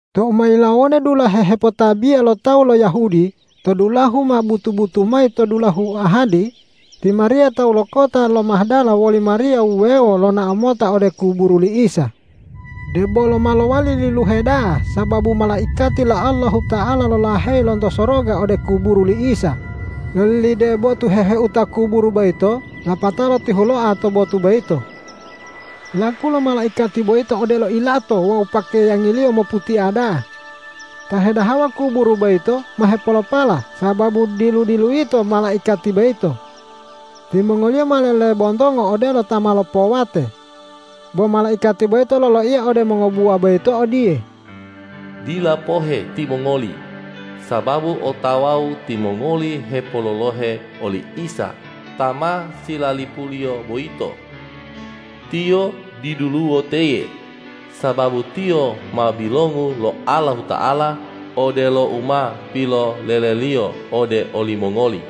Tou ma yilawode dulahe hepotabiya lo tawu lo Yahudi, tou dulahu ma butu-butu mayi to dulahu ahadi, ti Mariya tawu lo kota lo Mahdala woli Mariya wuwewo lonao mota ode kuburu li Isa. Debolo ma lowali liluhe da'a sababu malaikati lo Allahuta'ala lolaheyi lonto soroga ode kuburu li Isa, lolilide botu heu-heuta kuburu boyito lapatao lotihuloa to botu boyito. Laku lo malaikati boyito odelo ilato wawu pakeyangiliyo moputia da'a. Ta hedahawa kuburu boyito ma hepolopala sababu dilu-diluyito malaikati boyito. Timongoliyo ma lelebontongo odelo ta ma lopowate. Bo malaikati boyito loloiya ode mongobuwa boyito odiye,”Dila pohe timongoli, sababu otawau timongoli hepololohe oli Isa ta ma silalipuliyo boyito. Tiyo diduluwo teye, sababu Tiyo ma bilongu lo Allahuta'ala odelo u ma pilolele-Liyo ode olimongoli.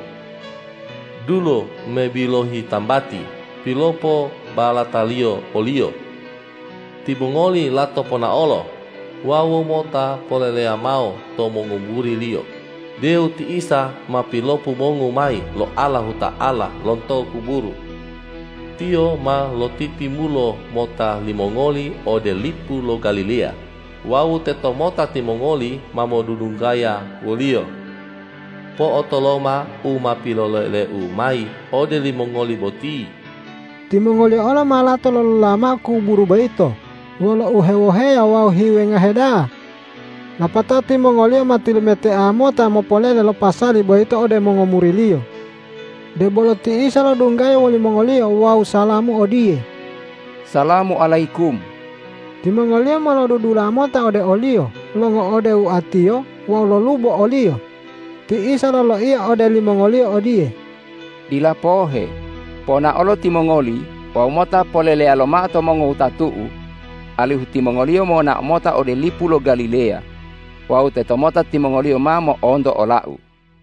Dulo me bilohi tambati pilopobalataliyo o-Liyo. Timongoli lato ponaolo wawu mota poleleya mao to mongomuri-Liyo deu ti Isa ma pilopobongu mayi lo Allahuta'ala lonto kuburu. Tiyo ma lotitimulo mota limongoli ode lipu lo Galileya wawu teto mota timongoli ma modudunggaya wo-Liyo. Po'otoloma u ma piloleleu mayi ode limongoli boti.” Timongoliyo olo ma lato lolola mao kuburu boyito wolo uhewoheya wawu hiwengahe da'a. Lapatao timongoliyo ma tilumetea mota mopolele lo pasali boyito ode mongomuri-Liyo. Debolo ti Isa lodunggaya wolimongoliyo wawu salamu odiye,”Salamu alayikum.” Timongoliyo ma lodudula mota ode o-Liyo longo'ode oatiyo wawu lolubo o-Liyo. Ti Isa loloiya ode limongoliyo odiye,”Dila pohe. Ponaolo timongoli wawu mota poleleyalo mao to mongowutatu-U, alihu timongoliyo monao mota ode lipu lo Galileya wawu tetomota timongoliyo ma mo'onto ola-U.”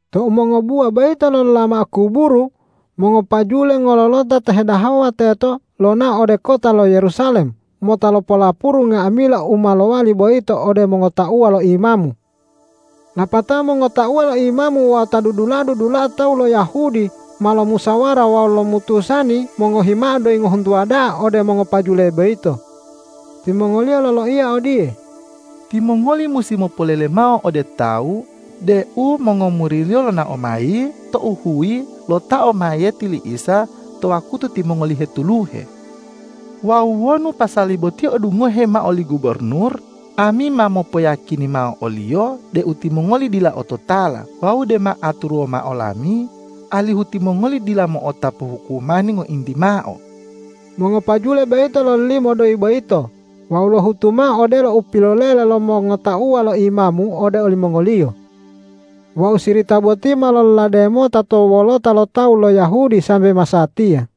Tou mongobuwa boyito lolola mao kuburu, mongopajule ngololota ta hedahawa teto lonao ode kota lo Yerusalem mota lopolapuru nga'amila u ma lowali boyito ode mongotauwa lo imamu. Lapatao mongotauwa lo imamu wawu ta dudula'a-dudula'a tawu lo Yahudi ma lomusawara wawu lomutusani mongohi mao doyi ngohuntuwa da'a ode mongopajule boyito. Timongoliyo loloiya odiye,”Timongoli musi mopolele mao ode tawu deu mongomuri-Liyo lonao mayi tou huyi lotao mayiyeti li Isa to wakutu timongoli hetuluhe. Wawu wonu pasali boti odungohe mao li gubornur, ami ma mopoyiyakini mao oliyo deu timongoli dila ototala wawu dema aturuwo mao lami, alihu timongoli dila mo'otapu hukumani ngointi mao.” Mongopajule boyito lololimo doyi boyito wawu lohutu mao odelo upilolele lo mongotauwa lo imamu ode olimongoliyo. Wawu sirita boti ma lololade mota to wolota lo tawu lo Yahudi sambe masatiya.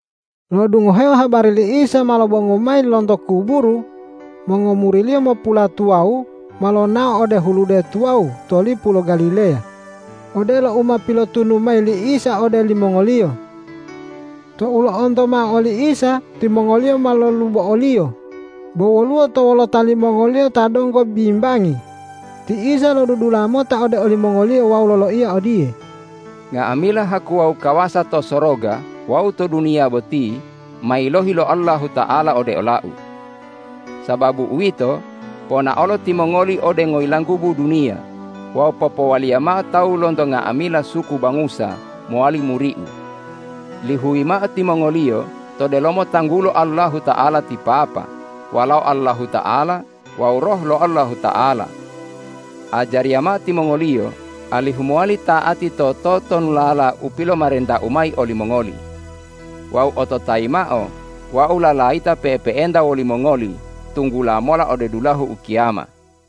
Lo'odungoheo habari li Isa ma lobongu mayi lonto kuburu mongomuri-Liyo mopulatuwawu ma lonao ode hulude tuwawu to lipu lo Galileya, odelo u ma pilotunu mayi li Isa ode limongoliyo. Tou lo'onto mao oli Isa, timongoliyo ma lolubo o-Liyo, bo woluwo to wolota limongoliyo ta donggo bimbangi. Ti Isa lodudula mota ode olimongoliyo wawu loloiya odiye,”Nga'amila haku wawu kawasa to soroga wawu to duniya boti ma yilohi lo Allahuta'ala ode ola-U. Sababu uwito, ponaolo timongoli ode ngoyilanggubu duniya wawu popowaliya mao tawu lonto nga'amila suku bangusa mowali muri-U. Lihuyi mao timongoliyo to delomo tanggulo Allahuta'ala ti Papa, Walao Allahuta'ala wawu Roh lo Allahuta'ala. Ajariya mao timongoliyo alihu mowali ta'ati to totonulala u pilomarenta-U mayi olimongoli. Wawu ototayi mao: Wau lalayita pe'epe'enta wolimongoli tunggula mola ode dulahu ukiyama.”